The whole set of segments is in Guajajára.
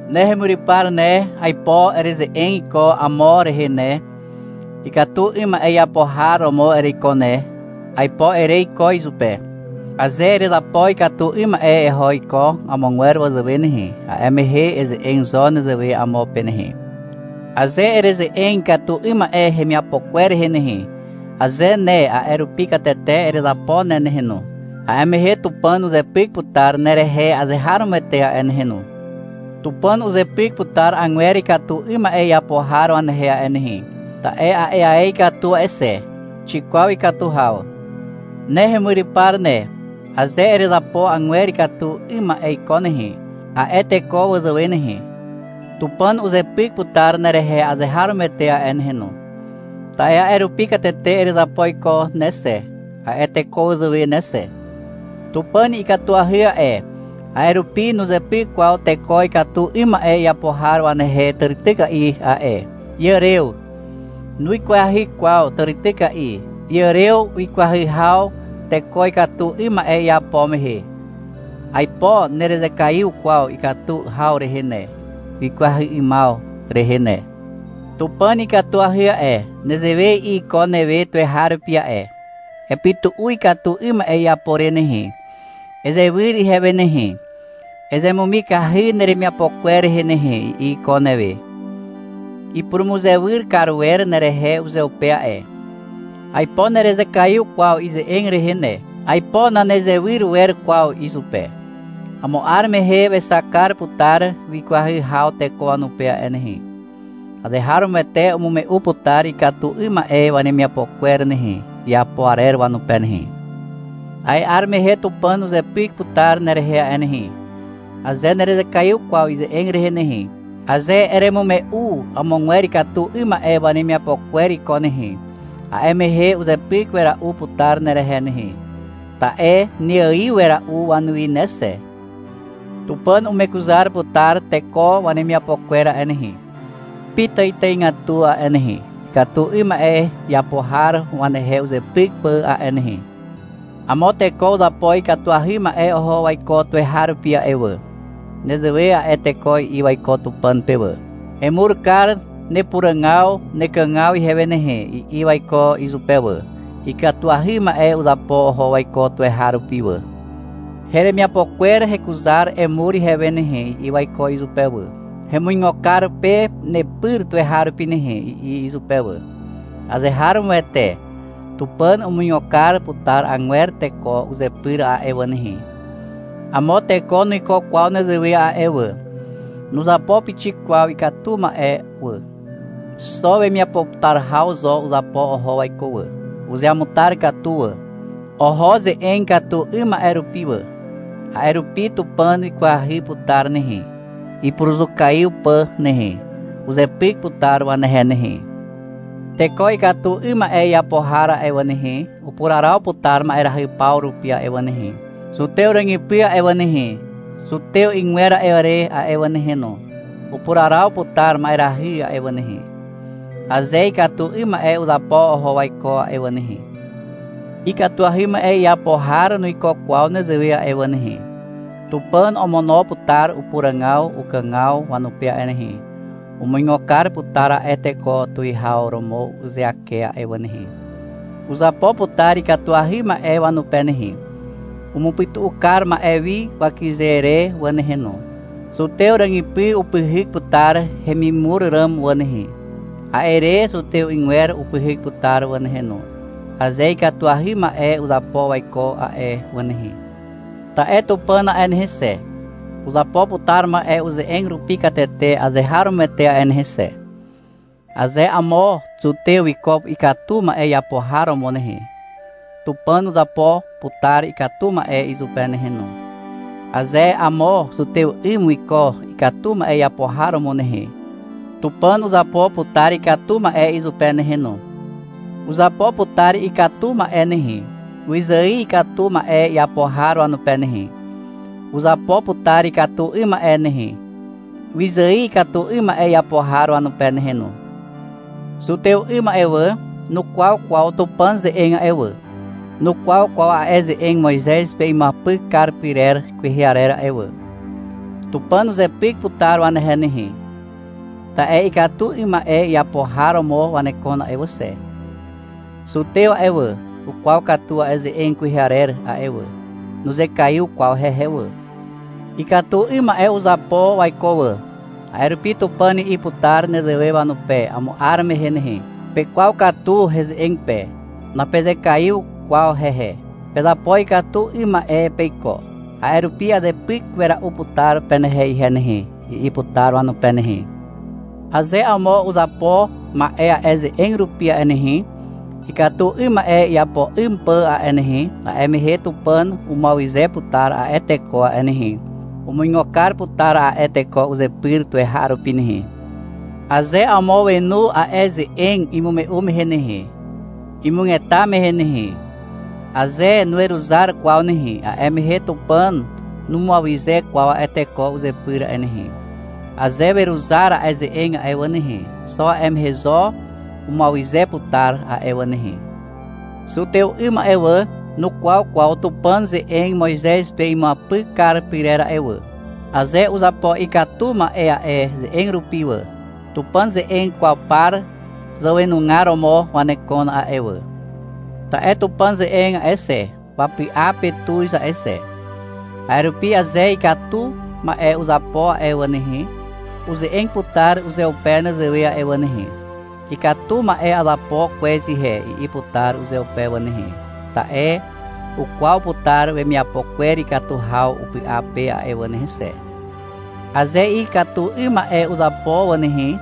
Ne hemyrypar ne, aipo ereze'eg iko amo rehe ne. — Ikatu 'ym ma'e iapo har romo ereiko ne, aipo ere iko izupe. Aze erezapo ikatu 'ym ma'e eho iko amogwer wazàwe nehe, a'e mehe eze'eg zo nezewe amo pe nehe. Aze ereze'eg ikatu 'ym ma'e hemiapo kwer rehe nehe, aze ne a'e rupi katete erezapo ne nehe no, a'e mehe Tupàn uzepyk putar nerehe azeharomoete a'e nehe no. Tupàn uzepyk putar agwer ikatu 'ym ma'e iapo har wanehe a'e nehe, ta'e a'e ae ikatu a'e xe. Xikwaw ikatu haw. Ne hemyrypar ne, aze erezapo agwer ikatu 'ym ma'e iko nehe, a'e teko wazàwe nehe, Tupàn uzepyk putar nerehe azeharomoete a'e nehe no, ta'e a'e rupi katete erezapo iko ne xe, a'e teko wazàwe ne xe. Tupàn ikatuahy a'e, a'e rupi nuzepyk kwaw teko ikatu 'ym ma'e iapo har wanehe tàrityka'i a'e. Iàrew. Nuikwahy kwaw tàrityka'i, iàrew ikwahy haw teko ikatu 'ym ma'e iapo mehe. Aipo nerezekaiw kwaw ikatu haw rehe ne, ikwahy 'ymaw rehe ne. Tupàn ikatuahy a'e. Nezewe i'i iko newe tuweharupi a'e. — Epytu'u ikatu 'ym ma'e iapo re nehe, ezewyr ihewe nehe, ezemumikahy neremiapo kwer rehe nehe, i'i iko newe. Ipurumuzewyr kar wer nerehe uzeupe a'e. Aipo nerezekaiw kwaw ize'eg rehe ne. Aipo nanezewyr wer kwaw izupe. Amo 'ar mehe wexak kar putar wikwahy haw teko wanupe a'e nehe. Azeharomoete umume'u putar ikatu 'ym ma'e wanemiapo kwer nehe, iapo arer wanupe nehe. A'e 'ar mehe Tupàn uzepyk putar nerehe a'e nehe, aze nerezekaiw kwaw ize'eg rehe nehe. Aze eremume'u amogwer ikatu 'ym ma'e wanemiapo kwer iko nehe, a'e mehe uzepyk wera'u putar nerehe nehe. Ta'e neaiw wera'u wanuwi ne xe. Tupàn umekuzar putar teko wanemiapo kwer a'e nehe, pitàitàigatu a'e nehe, ikatu 'ym ma'e iapo har wanehe uzepyk pà a'e nehe. Amo teko uzapo ikatuahy ma'e oho waiko tuweharupi a'e wà. Nezewe a'e teko i'i waiko Tupàn pe wà. — Emur kar nepuràgaw nekàgaw ihewe nehe, i'i waiko izupe wà. Ikatuahy ma'e uzapo oho waiko tuweharupi wà. — Heremiapo kwer hekuzar emur ihewe nehe, i'i waiko izupe wà. — Hemuigo kar pe nepyr tuweharupi nehe, i'i izupe wà. Azeharomoete, Tupàn umuigo kar putar agwer teko uzepyr a'e wà nehe. Amo teko nuiko kwaw nezewe a'e wà. Nuzapo pixik kwaw ikatu ma'e wà. Xo wemiapo putar haw zo uzapo oho waiko wà. Uzeamutar katu wà. Oho ze'eg ikatu 'ym ma'e rupi wà. A'e rupi Tupàn wikwahy putar nehe, ipuruzukaiw pà nehe. Uzepyk putar wanehe nehe. Teko ikatu 'ym ma'e iapo har a'e wà nehe, upuraraw putar ma'erahy paw rupi a'e wà nehe. Zutew ràgypy a'e wà nehe, zutew 'ygwer a'e re a'e wà nehe no, upuraraw putar ma'erahy a'e wà nehe, aze ikatu 'ym ma'e uzapo oho waiko a'e wà nehe. Ikatuahy ma'e iapo har nuiko kwaw nezewe a'e wà nehe. Tupàn omono putar upuràgaw ukàgaw wanupe a'e nehe. Umuigo kar putar a'e teko tuwihaw romo uzeake a'e wà nehe. Uzapo putar ikatuahy ma'e wanupe nehe. Umupytu'u kar ma'e wi wakyze re wà nehe no. Zutew ràgypy upyhyk putar hemimur ràm wà nehe. A'e re zutew 'ygwer upyhyk putar wà nehe no, aze ikatuahy ma'e uzapo waiko a'e wà nehe. Ta'e Tupàn a'e nehe xe, uzapo putar ma'e uze'eg rupi katete azeharomoete a'e nehe xe. Aze amo zutew wiko ikatu ma'e iapo har romo nehe, Tupàn uzapo putar ikatu ma'e izupe nehe no. Aze amo zutew 'ym wiko ikatu ma'e iapo har romo nehe, Tupàn uzapo putar ikatu ma'e izupe nehe no. Uzapo putar ikatu ma'e nehe, wyzài ikatu ma'e iapo har wanupe nehe. Uzapo putar ikatu 'ym ma'e nehe, wyzài ikatu 'ym ma'e iapo har wanupe nehe no. Zutew 'ym a'e wà, nukwaw kwaw Tupàn ze'eg a'e wà, nukwaw kwaw a'e ze'eg Moizez pe imuapyk kar pyrer kwehe arer a'e wà. Tupàn uzepyk putar wanehe nehe, ta'e ikatu 'ym ma'e iapo har romo wanekon a'e wà xe. Zutew a'e wà, ukwaw katu a'e ze'eg kwehe arer a'e wà. Nuzekaiw kwaw hehe wà. Ikatu 'ym ma'e uzapo waiko wà. A'e rupi Tupàn i'i putar nezewe wanupe amo 'ar mehe nehe. — Pekwaw katu heze'eg pe. Napezekaiw kwaw hehe. Pezapo ikatu 'ym ma'e peiko. A'e rupi azepyk wera'u putar penehe ihe nehe, i'i putar wanupe nehe. Aze amo uzapo ma'e a'e ze'eg rupi a'e nehe, ikatu 'ym ma'e iapo 'ym pà a'e nehe, a'e mehe Tupàn umuawyze putar a'e teko a'e nehe. Umuigo kar putar a'e teko uzepyr tuweharupi nehe. Aze amo wenu a'e ze'eg imume'u mehe nehe, imugeta mehe nehe, aze nuweruzar kwaw nehe, a'e mehe Tupàn numuawyze kwaw a'e teko uzepyr a'e nehe. Aze weruzar a'e ze'eg a'e wà nehe, xo a'e mehe zo umuawyze putar a'e wà nehe. Zutew 'ym a'e wà, nukwaw kwaw Tupàn ze'eg Moizez pe imuapyk kar pyrer a'e wà. Aze uzapo ikatu ma'e a'e ze'eg rupi wà, Tupàn ze'eg kwaw par zàwenugar romo wanekon a'e wà. Ta'e Tupàn ze'eg a'e xe, wapy'a pe tuz a'e xe. A'e rupi aze ikatu ma'e uzapo a'e wà nehe, uze'eg putar uzeupe nezewe a'e wà nehe. — Ikatu ma'e azapo kwez ihe, i'i putar uzeupe wà nehe, ta'e ukwaw putar wemiapo kwer ikatu haw upy'a pe a'e wà nehe xe. Aze ikatu 'ym ma'e uzapo wà nehe,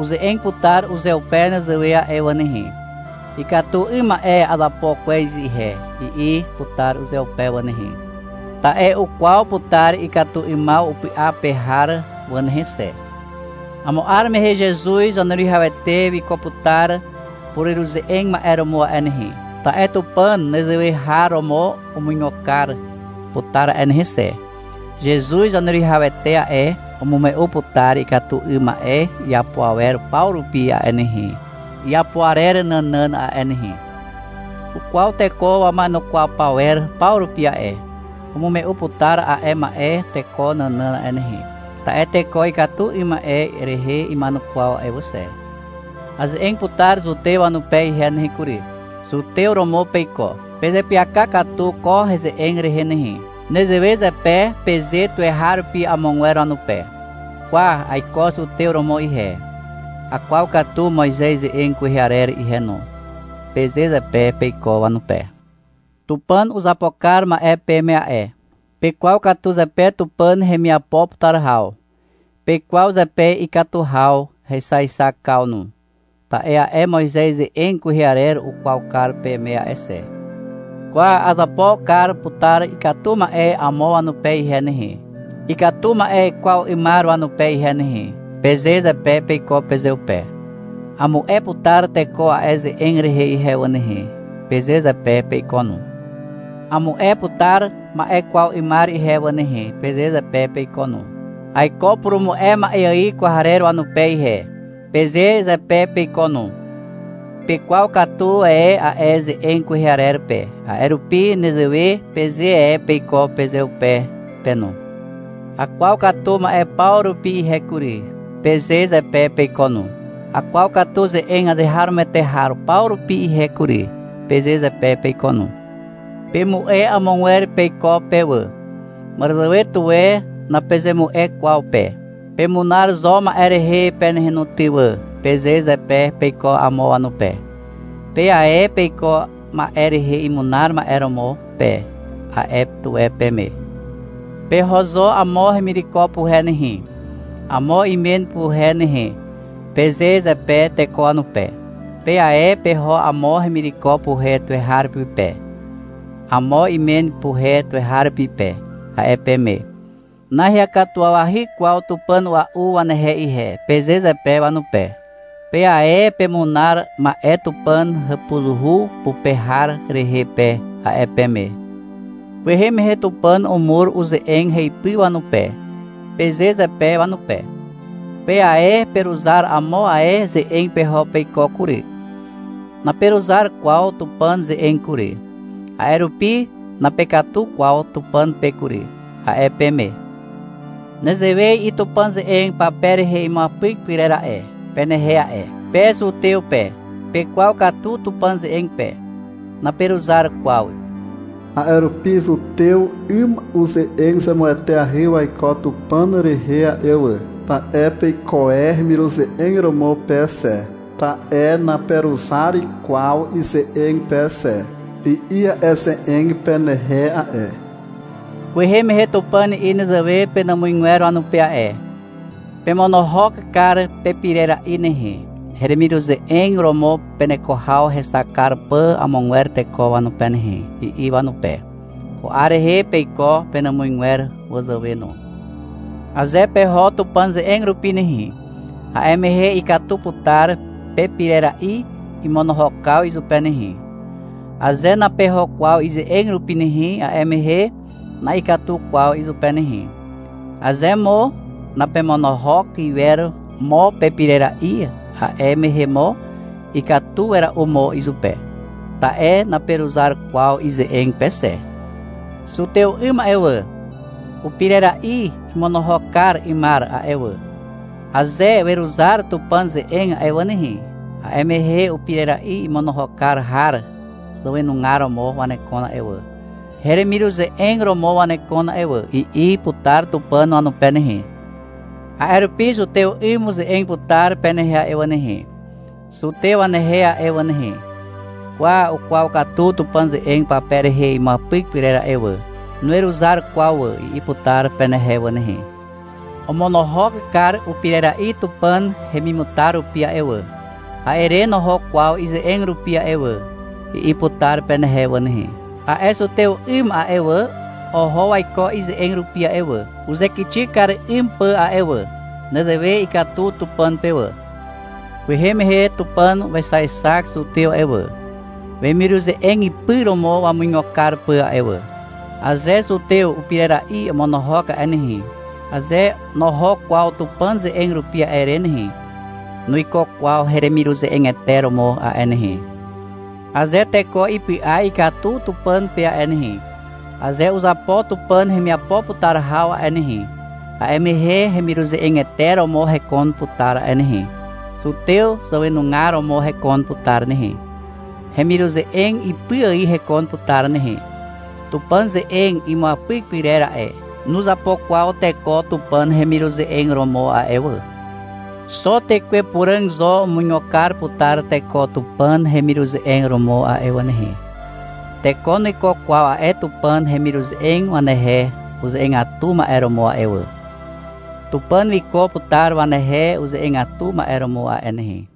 uze'eg putar uzeupe nezewe a'e wà nehe. — Ikatu 'ym ma'e azapo kwez ihe, i'i putar uzeupe wà nehe. Ta'e ukwaw putar ikatu 'ymaw upy'a pe har wà nehe xe. Amo 'ar mehe Zezuz Zaneruwihawete wiko putar pureruze'eg ma'e romo a'e nehe, ta'e Tupàn nezewe har romo umuigo kar putar a'e nehe xe. Zezuz Zaneruwihawete a'e, umume'u putar ikatu 'ym ma'e iapo awer paw rupi a'e nehe, iapo arer nànàn a'e nehe. Ukwaw teko wama'enukwaw pawer paw rupi a'e. Umume'u putar a'e ma'e teko nànàn a'e nehe. Ta'e teko ikatu 'ym ma'e rehe ima'enukwaw a'e wà xe. Aze'eg putar zutew wanupe ihe nehe kury. — Zutew romo peiko. Pezeapyaka katu ko heze'eg rehe nehe. Nezewe zepe peze tuweharupi amogwer wanupe. — Kwa, aiko zutew romo ihe, akwaw katu Moizez ze'eg kwehe arer ihe no, peze zepe peiko wanupe. Tupàn uzapo kar ma'e peme a'e. Pekwaw katu zepe Tupàn hemiapo putar haw. Pekwaw zepe ikatu haw hexaexakaw no, ta'e a'e Moizez ze'eg kwehe arer ukwaw kar peme a'e xe. — Kwa, azapo kar putar ikatu ma'e amo wanupe ihe nehe, ikatu ma'e kwaw 'ymar wanupe ihe nehe, peze zepe peiko pezeupe. — Amu'e putar teko a'e ze'eg rehe ihe wà nehe, peze zepe peiko no. — Amu'e putar ma'e kwaw 'ymar ihe wà nehe, peze zepe peiko no. — Aiko purumu'e ma'e ài kwarer wanupe ihe, peze zepe peiko no. Pekwaw katu e a'e ze'eg kwehe arer pe, a'e rupi nezewe peze e peiko pezeupe pe no. — Akwaw katu ma'e paw rupi ihe kury, peze zepe peiko no. — Akwaw katu ze'eg azeharomoete har paw rupi ihe kury, peze zepe peiko no. Pemu'e amogwer peiko pe wà. Màràzàwe tuwe napezemu'e kwaw pe. — Pemunar zo ma'e rehe pe nehe no ty wà, peze zepe peiko amo wanupe. — Pe ae peiko ma'e rehe imunar ma'e romo pe, a'e tuwe peme. — Peho zo amo hemireko puhe nehe, amo imen puhe nehe, peze zepe teko wanupe. — Pe ae peho amo hemireko puhe tuweharupi pe, amo imen puhe tuweharupi pe, a'e peme. — Naheakatuwawahy kwaw tupàn a'ua'u wanehe ihe, peze zepe wanupe. — Pe ae pemunar ma'e Tupàn hàpuzuhu pupe har rehe pe, a'e peme. — Kwehe mehe Tupàn umur uze'eg heipy wanupe, peze zepe wanupe. — Pe ae peruzar amo ae ze'eg peho peiko kury. Naperuzar kwaw Tupàn ze'eg kury. A'e rupi napekatu kwaw Tupàn pe kury, a'e peme. Nezewe i'i Tupàn ze'eg pape rehe imuapyk pyrer a'e, penehe a'e. — Pe zutew pe, pekwaw katu Tupàn ze'eg pe. Naperuzar kwaw. A'e rupi zutew 'ym uze'eg zemueteahy waiko Tupàn rehe a'e wà, ta'e peiko e hemiruze'eg romo pe xe, ta'e naperuzar kwaw ize'eg pe xe, i'i a'e ze'eg penehe a'e. Kwehe mehe Tupàn i'i nezewe penàmuzgwer wanupe a'e. — Pemonohok kar pepirera'i nehe, heremiruze'eg romo peneko haw hexak kar pà amogwer teko wanupe nehe, i'i wanupe. Ko 'ar rehe peiko penàmuzgwer wazàwe no. Aze peho Tupàn ze'eg rupi nehe, a'e mehe ikatu putar pepirera'i imonohokaw izupe nehe. Aze napeho kwaw ize'eg rupi nehe, a'e mehe na'ikatu kwaw izupe nehe. Aze mo napemonohok iwer mo pepirera'i, a'e mehe mo ikatu wera'u mo izupe, ta'e naperuzar kwaw ize'eg pe xe. Zutew 'ym a'e wà, upirera'i imonohok kar 'ymar a'e wà, aze weruzar Tupàn ze'eg a'e wà nehe, a'e mehe — Upirera'i imonohok kar har zàwenugar romo wanekon a'e wà, heremiruze'eg romo wanekon a'e wà, i'i putar Tupàn wanupe nehe. A'e rupi zutew 'ym uze'eg putar penehe a'e wà nehe, zutew wanehe a'e wà nehe. — Kwa, ukwaw katu Tupàn ze'eg pape rehe imuapyk pyrer a'e wà. Nuweruzar kwaw wà, i'i putar penehe wà nehe. — Omonohok kar upirera'i Tupàn hemimutar rupi a'e wà, a'e re noho kwaw ize'eg rupi a'e wà, i'i putar penehe wà nehe. A'e zutew 'ym a'e wà, oho waiko ize'eg rupi a'e wà, uzekixi kar 'ym pà a'e wà. Nezewe ikatu Tupàn pe wà. Kwehe mehe Tupàn wexaexak zutew a'e wà, wemiruze'eg ipy romo wamuigo kar pà a'e wà. Aze zutew upirera'i omonohok a'e nehe, aze noho kwaw Tupàn ze'eg rupi a'e re nehe, nuiko kwaw hemiruze'egete romo a'e nehe. Aze teko ipy'a ikatu Tupàn pe a'e nehe, aze uzapo Tupàn hemiapo putar haw a'e nehe, a'e mehe hemiruze'egete romo hekon putar a'e nehe. Zutew zàwenugar romo hekon putar nehe. Hemiruze'eg ipy ài hekon putar nehe. Tupàn ze'eg imuapyk pyrer a'e, nuzapo kwaw teko Tupàn hemiruze'eg romo a'e wà. Xo Tekwe Puràg zo umuigo kar putar teko Tupàn hemiruze'eg romo a'e wà nehe. Teko nuiko kwaw a'e Tupàn hemiruze'eg wanehe uze'egatu ma'e romo a'e wà. Tupàn wiko putar wanehe uze'egatu ma'e romo a'e nehe.